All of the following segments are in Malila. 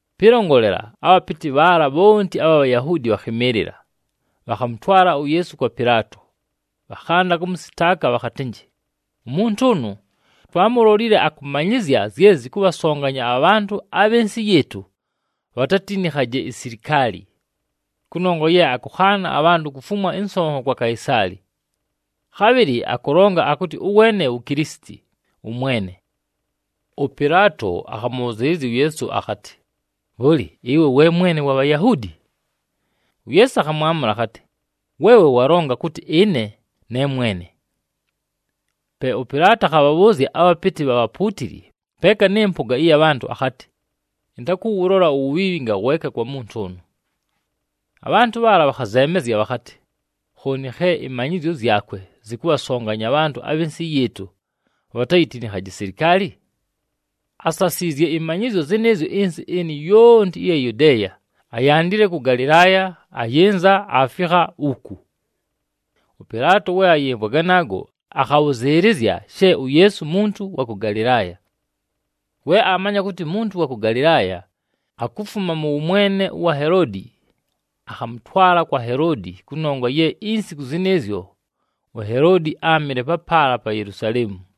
Pɨlongolela, abhapɨtɨ bhaala bhonti abha Bhayahuudi bhakhɨmɨɨlɨla, bhakhamʉtwala uYeesu kwa Pɨlaato. Bhakhanda kʉmʉsɨtaaka bhakhatɨnjɨ, “Umuntu ʉnʉ, twaamulolile akʉmanyɨzya zye zɨkʉbhasonganya abhantʉ abhɨ nsɨ yɨɨtʉ bhatatinikhaje isilikaali. Kʉnongwa ye akʉkhaana abhantʉ kufumwa ɨnsonho kwa Kaisaali, khabhɨlɨ akʉlonga akʉtɨ ʉweene wu Kilisiti, ʉMwene.” ɄPɨlaato akhamʉbhʉzɨɨlɨzya uYeesu akhatɨ, “Bhʉlɨ, ɨwe we Mwene wa Bhayahuudi?” UYeesu akhamwamʉla akhatɨ, “Weewe walonga kʉtɨ ɨne ne mwene.” Pe ʉPɨlaato akhabhabhʉʉzya abhapɨtɨ bha bhapuutili, peeka nɨ mpʉga ɨya bhantʉ akhatɨ, “Ɨntakʉwʉlola uwubhiibhi ngaweeka kwa muntu ʉnʉ.” Abhantʉ bhaala, bhakhazeemezya bhakhatɨ, “Khooni khe ɨmanyɨzyo zyakwe zɨkʉbhasonganya abhantʉ abhɨ nsɨ yɨɨtʉ bhatayitinikhaje isilikaali! Asasiizye ɨmanyɨzyo zɨnɨɨzyo ɨnsɨ ɨnɨ yonti ɨya Yudeeya, ayandile kʉ Galɨlaaya ayɨnza aafikha uku.” ɄPɨlaato we ayɨmvwa ganaago, akhabhʉzɨɨlɨzya she uYeesu muntu wa kʉ Galɨlaaya. We aamanya kʉtɨ muntu wa kʉ Galɨlaaya, akufuma mʉ wʉmwene ʉwa Heloodi, akhamʉtwala kwa Heloodi kʉnongwa ye insiku zɨnɨɨzyo, uHeloodi áamɨle papaala pa Yelusaleemu.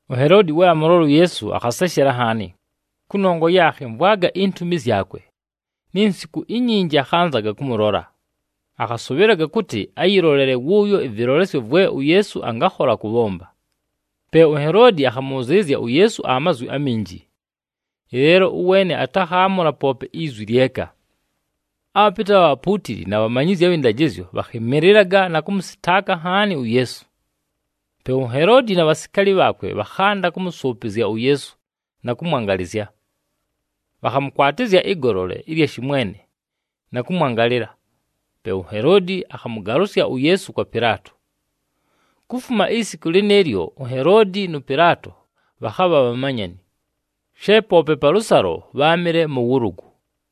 UHeloodi we amʉlola uYeesu, akhaseshela nhaani, kʉnongwa ye akhɨmvwaga intumi zyakwe, ni nsiku inyinji akhanzaga kʉmʉlola. Akhasʉbhɨlaga kʉtɨ ayɨlolele wʉʉyo ɨvɨlolesyo vwe uYeesu angakhola kʉbhomba. Pe uHeloodi akhamʉbhʉzɨɨlɨzya uYeesu amazwi aminji, ɨleelo ʉweene atakhaamʉla poope izwi lyeka. Abhapɨtɨ abha bhapuutili na bhamanyizyi abhɨ ndajɨzyo bhakhɨmɨlɨlaga na kʉmʉsɨtaaka nhaani uYeesu. Pe uHeloodi na bhasikaali bhaakwe bhakhanda kʉmʉsʉʉpɨzya uYeesu na kʉmwangalɨzya. Bhakhamʉkwatɨzya ɨgolole ɨlya shɨmwene na kʉmwangalɨla. Pe uHeloodi akhamʉgalʉsya uYeesu kwa Pɨlaato. Kufuma isiku lɨnɨɨlyo, uHeloodi nʉ Pɨlaato bhakhabha bhamanyani, she poope palʉsalo bháamɨle mʉ wʉlʉgʉ.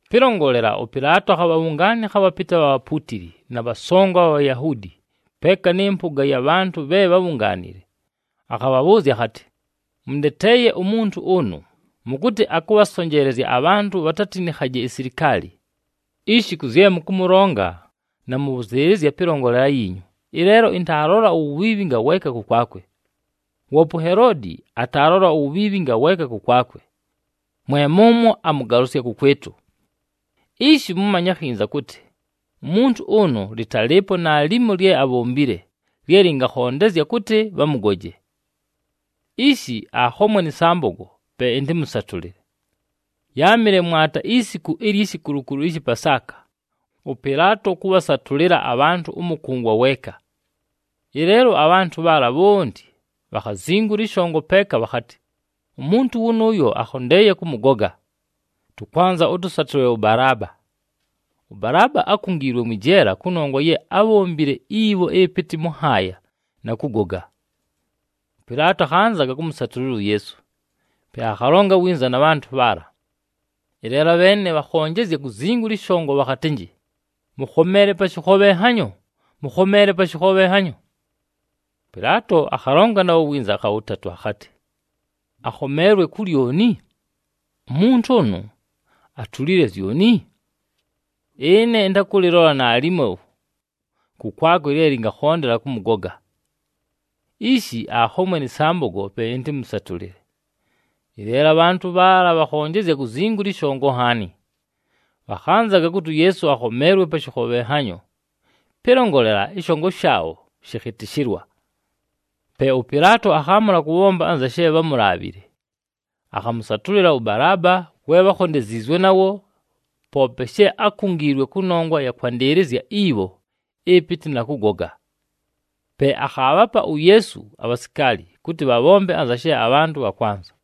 Pɨlongolela, ʉPɨlaato akhabhabhʉngaanɨkha abhapɨtɨ abha bhapuutili, na bhasongo abha Bhayahuudi, peeka nɨ mpʉga ya bhantʉ bhe bhábhungaanile. Akhabhabhʉʉzya akhatɨ, “Mʉndeteeye umuntu ʉnʉ, mʉkʉtɨ akʉbhasonjeelezya abhantʉ bhatayitinikhaje isilikaali. Ishi kʉ zye mʉkʉmʉlonga, namʉbhʉzɨɨlɨzya pɨlongolela yiinyu, ɨleelo ɨntaalola uwubhiibhi ngaweeka kʉkwakwe. Woope uHeloodi ataalola uwubhiibhi ngaweeka kʉkwakwe, mwe mʉmwo amʉgalʉsya kʉkwɨtʉ. Ishi mʉmanye akhinza kʉtɨ, umuntu ʉnʉ, lɨtalɨɨpo naalimo lye abhombile, lye lɨngakhondezya kʉtɨ bhamʉgoje. Ishi, akhomwe nɨ sambogo, pe ɨntɨmʉsatʉlɨle.” [ Yáamɨle mwata isiku ilyi shikulukulu ɨshɨ Pasaaka, ʉPɨlaato kʉbhasatʉlɨla abhantʉ ʉmʉkʉngwa weeka.] Ɨleelo abhantʉ bhaala bhonti bhakhazingula ɨshongo peeka bhakhatɨ, “Umuntu wʉnʉʉyo, akhondeeye kʉmʉgoga! Tʉkwanza ʉtʉsatʉlɨle ʉBalaaba!” ɄBalaaba ákungiilwe mwɨ jeela kʉnongwa ye ábhombile ibho ɨpɨtɨ mʉ nhaaya, na kʉgoga. ɄPɨlaato akhanzaga kʉmʉsatʉlɨla uYeesu, pe akhalonga winza na bhantʉ bhaala. Ɨleelo abheene bhakhonjezya kuzingula ɨshongo bhakhatɨnjɨ, “Mʉkhomeele pa shɨkhobhenhanyo! Mʉkhomeele pa shɨkhobhenhanyo!” ɄPɨlaato akhalonga nabho winza akha wʉtatʉ akhatɨ, “Akhomeelwe ku lyoni? Umuntu ʉnʉ, atulile zyoni? Ɨne ɨntakʉlɨlola naalimo kʉkwakwe lye lɨngakhondela kʉmʉgoga! Ishi akhomwe nɨ sambogo, pe ɨntɨmʉsatʉlɨle.” Ɨleelo abhantʉ bhaala bhakhonjezya kuzingula ɨshongo nhaani, bhakhanzaga kʉtɨ uYeesu akhomeelwe pa shɨkhobhenhanyo. Pɨlongolela, ɨshongo shaabho shɨkhɨtɨshɨlwa. Pe ʉPɨlaato akhaamʉla kʉbhomba anza she bhámulaabhile. Akhamʉsatʉlɨla ʉBalaaba we bhákhondeziizwe nawo, poope she ákungiilwe kʉnongwa ɨya kwandɨɨlɨzya ibho ɨpɨtɨ na kʉgoga. Pe akhaabhapa uYeesu abhasikaali kʉtɨ bhabhombe anza she abhantʉ bhakwanza.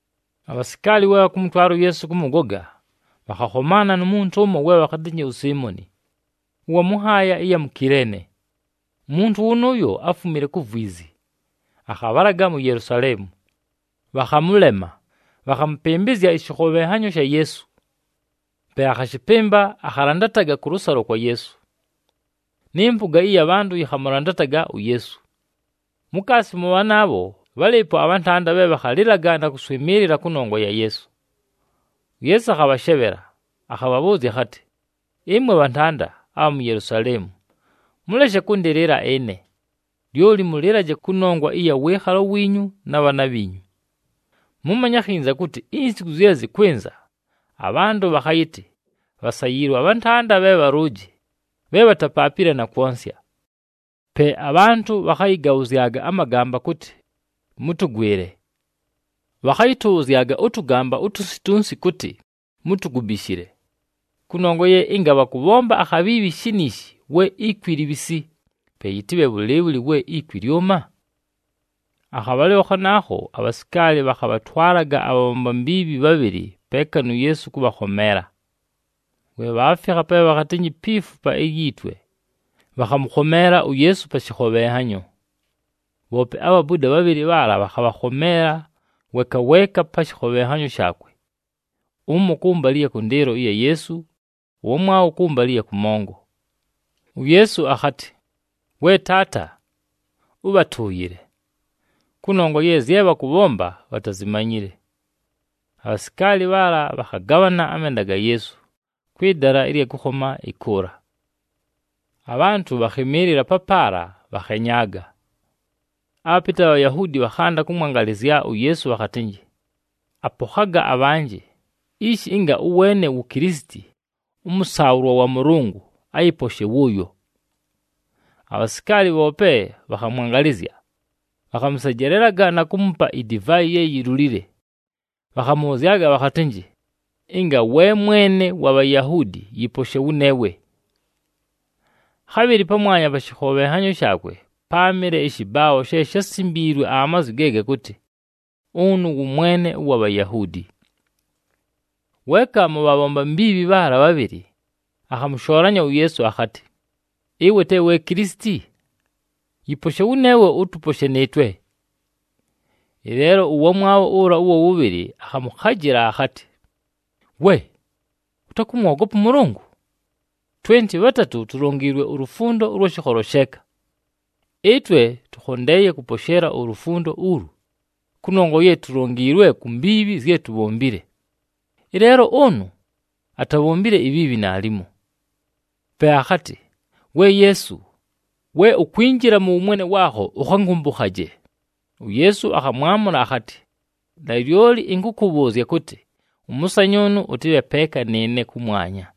Abhasikaali we bhakʉmʉtwala uYeesu kʉmʉgoga, bhakhakhomaana nu muntu ʉmo we bhakhatɨnjɨ uSiimoni, ʉwa mʉ nhaaya ɨya mu Kileene. Umuntu wʉnʉʉyo áfumile ku vwizi, akhabhalaga mu Yelusaleemu. Bhakhamʉlema, bhakhamʉpɨmbɨzya ɨshɨkhobhenhanyo sha Yeesu. Pe akhashɨpɨmba, akhalandataga kʉlʉsalo kwa Yeesu. Nɨ mpʉga ɨya bhantʉ yɨkhamʉlandataga uYeesu. Mukaasi mʉ bhanaabho, bhálɨɨpo abhantanda bhe bhakhalɨlaga na kʉswɨmɨɨlɨla kʉnongwa ya Yeesu. UYeesu akhabhashebhela, akhabhabhʉʉzya akhatɨ, “Ɨmwe bhantanda abha mu Yelusaleemu! Mʉleshe kʉndɨlɨla ɨne! Lyoli mʉlɨlaje kʉnongwa ɨya wɨɨkhalo wiinyu na bhaana bhiinyu! Mʉmanye akhinza kʉtɨ insiku zye zɨkwɨnza, abhantʉ bhakhayɨtɨ, ‘Bhasayiilwe abhantanda bhe bhalʉʉjɨ, bhe bhatapaapile na kwonsya!’ Pe, ‘Abhantʉ bhakhayɨgabhʉzyaga amagamba kʉtɨ, “Mʉtʉgwɨle!” Bhakhayɨtʉbhʉzyaga ʉtʉgamba utunsi tunsi kʉtɨ, “Mutugubishile!” ’ Kʉnongwa ye ɨnga bhakʉbhomba akhabhiibhi shiniishi, we ikwi libhisi, pe yɨtɨbhe bhʉlɨɨbhʉlɨ we ikwi lyʉma?” Akhabhalɨlo khanaakho, abhasikaali bhakhabhatwalaga abhabhomba mbiibhi bhabhɨlɨ peeka nu Yeesu kʉbhakhomeela. We bhaafikha pe bhakhatɨnjɨ, “Pi Fupa ilyi Twe,” bhakhamʉkhomeela uYeesu pa shɨkhobhenhanyo. Bhoope abhabuda bhabhɨlɨ bhaala bhakhabhakhomeela, weeka weeka pa shɨkhobhenhanyo shaakwe, ʉmo kʉmbalɨ ɨya kʉndɨɨlo ɨya Yeesu, ʉwamwabho kʉmbalɨ ɨya kʉmongo. UYeesu akhatɨ, “We Taata! Ʉbhatʉʉyɨle! Kʉnongwa ye zye bhakʉbhomba, bhatazimanyile.” Abhasikaali bhaala bhakhagabhana amenda ga Yeesu, kwɨ dala ɨlya kʉkhoma ɨkʉʉla. Abhantʉ bhakhɨmɨɨlɨla papaala, bhakhenyaaga. Abhapɨtɨ abha Bhayahuudi, bhakhanda kʉmwangalɨzya uYeesu bhakhatɨnjɨ, “Apokhaga abhanjɨ! Ishi, ɨnga ʉweene wu Kilisiti ʉmʉsaabhʉlwa wa Mʉlʉngʉ, ayɨposhe wʉʉyo!” Abhasikaali bhoope, bhakhamwangalɨzya. Bhakhamʉsejelelaga na kuumupa idivaayi ye yilulile, bhakhamʉbhʉzyaga bhakhatɨnjɨ, “Ɨnga we Mwene wa Bhayahuudi, yɨposhe wʉneewe!” Khabhɨlɨ pamwanya pa shɨkhobhenhanyo shaakwe, páamɨle ɨshɨbaabho she shásimbiilwe amazwi ge gakʉtɨ, “Ʉnʉ wʉ Mwene ʉwa Bhayahuudi.” Weeka mʉ bhabhomba mbiibhi bhaala bhabhɨlɨ, akhamʉshoolanya uYeesu akhatɨ, “Ɨwe te we Kilisiti? Yɨposhe wʉneewe, ʉtʉposhe nɨɨtwe!” Ɨleelo ʉwamwabho ʉla ʉwa wʉbhɨlɨ akhamʉkhajɨla akhatɨ, “We! Ʉtakʉmwogopa ʉMʉlʉngʉ? Twenti bhatatʉ tulongiilwe ulufundo ʉlwa shɨkholo sheeka. Ɨtwe tʉkhondeeye kʉposheela ulufundo ulu, kʉnongwa ye tulongiilwe ku mbiibhi zye tubhombile. Ɨleelo ʉnʉ, atabhombile ibhiibhi naalimo.” Pe akhatɨ, “We Yeesu! We ukwinjila mʉ wʉmwene waakho, ʉkhankʉmbʉkhaje!” UYeesu akhamwamʉla akhatɨ, “Nalyoli ɨnkʉkʉbhʉʉzya kʉtɨ, ʉmʉsanyʉʉnʉ ʉtɨbhe peeka nɨɨne kʉmwanya.”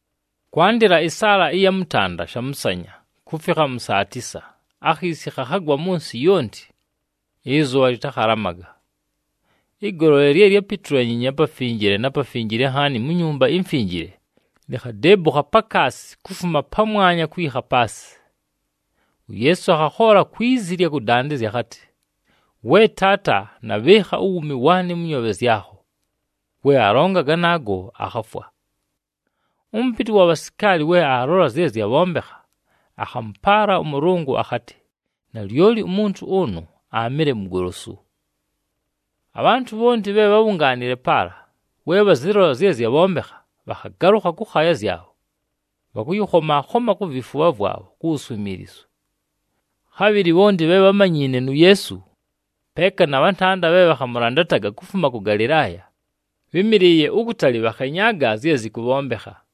Kwandɨla ɨsaala ɨya mʉtanda shamʉsanya, kufikha mʉ saa tisa, akhiisi khakhagwa mʉ nsɨ yonti, ɨzʉbha lɨtakhalamaga. Ɨgolole lye lyápitulanyiinye aPafinjile na Pafinjile Nhaani mu Nyumba iMfinjile, likhadeebukha pakaasi kufuma pamwanya kwikha paasɨ. UYeesu akhakhoola kwi zi ɨlya kʉdandɨzya akhatɨ, “We Taata! Nabhɨɨkha uwuumi waanɨ mʉ nyoobhe zyakho.” We alonga ganaago, akhafwa. Ʉmʉpɨtɨ ʉwa bhasikaali we aalola zye zyabhombekha, akhamʉpaala ʉMʉlʉngʉ akhatɨ, “Nalyoli umuntu ʉnʉ aamɨle mugolosu!” Abhantʉ bhonti bhe bhábhungaanile papaala, we bhazɨlola zye zyabhombekha, bhakhagalʉkha kʉkhaaya zyabho, bhakʉyɨkhoma-khoma ku vifubha vwabho ku wuswimiilizu. Khabhɨlɨ bhonti bhe bhámanyiine nu Yeesu, peeka na bhantanda bhe bhakhamʉlandataga kufuma kʉ Galɨlaaya, bhɨ́mɨlɨɨye ukutali bhakhenyaaga zye zɨkʉbhombekha.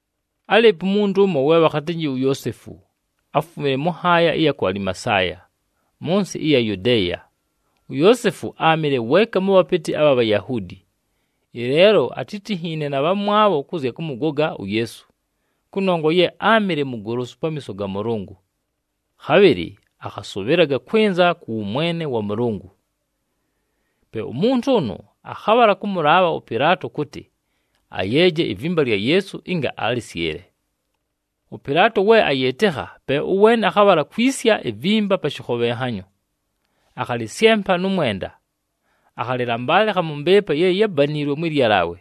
Álɨɨpo umuntu ʉmo, we bhakhatɨnjɨ uYoosefu, áfumile mʉ nhaaya ɨya ku Alimasaaya, mʉ nsɨ ɨya Yudeeya. UYoosefu áamɨle weeka mʉ bhapɨtɨ abha Bhayahuudi. Ɨleelo atítinhiine na bhamwabho kʉ zya kʉmʉgoga uYeesu, kʉnongwa ye áamɨle mugolosu pamiiso ga Mʉlʉngʉ. Khabhɨlɨ akhasʉbhɨlaga kwɨnza kʉ wʉmwene wa Mʉlʉngʉ. Pe umuntu ʉnʉ akhabhala kʉmʉlaabha ʉPɨlaato kʉtɨ, ayeeje ivimba lya Yeesu ɨnga alɨsyɨle. ɄPɨlaato we ayɨɨtɨkha, pe ʉweene akhabhala kwisya ivimba pa shɨkhobhenhanyo. Akhalɨsyempa nʉ mwenda, akhalɨlambalɨkha mʉ mbɨɨpa ye yábaniilwe mwɨ lyalaawe.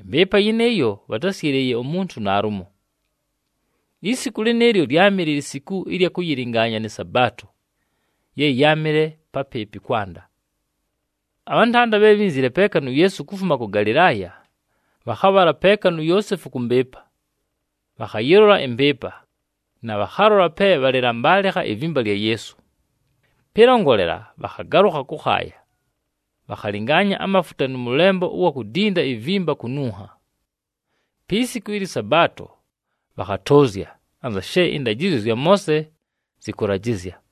Ɨmbɨɨpa yɨnɨɨyo, bhatásyɨlɨɨye umuntu naalumo. Isiku lɨnɨɨlyo, lyámɨle lisiku ɨlya kʉyɨlɨngaanya nɨ Sabaato, ye yáamɨle papɨɨpɨ kwanda. Abhantanda bhe bhínzile peeka nu Yeesu kufuma kʉ Galɨlaaya, bhakhabhala peeka nu Yoosefu kʉ mbɨɨpa. Bhakhayɨlola ɨmbɨɨpa, na bhakhalola pe bhakhalɨlambalɨkha ivimba lya Yeesu. Pɨlongolela, bhakhagalʉkha kʉkhaaya, bhakhalɨngaanya amafuta nʉ mʉlembo ʉwa kudinda ivimba kununha. Pi siku ɨlyɨ Sabaato bhakhatʉʉzya, anza she ɨndajɨzyo zya Moose zɨkʉlajɨzya.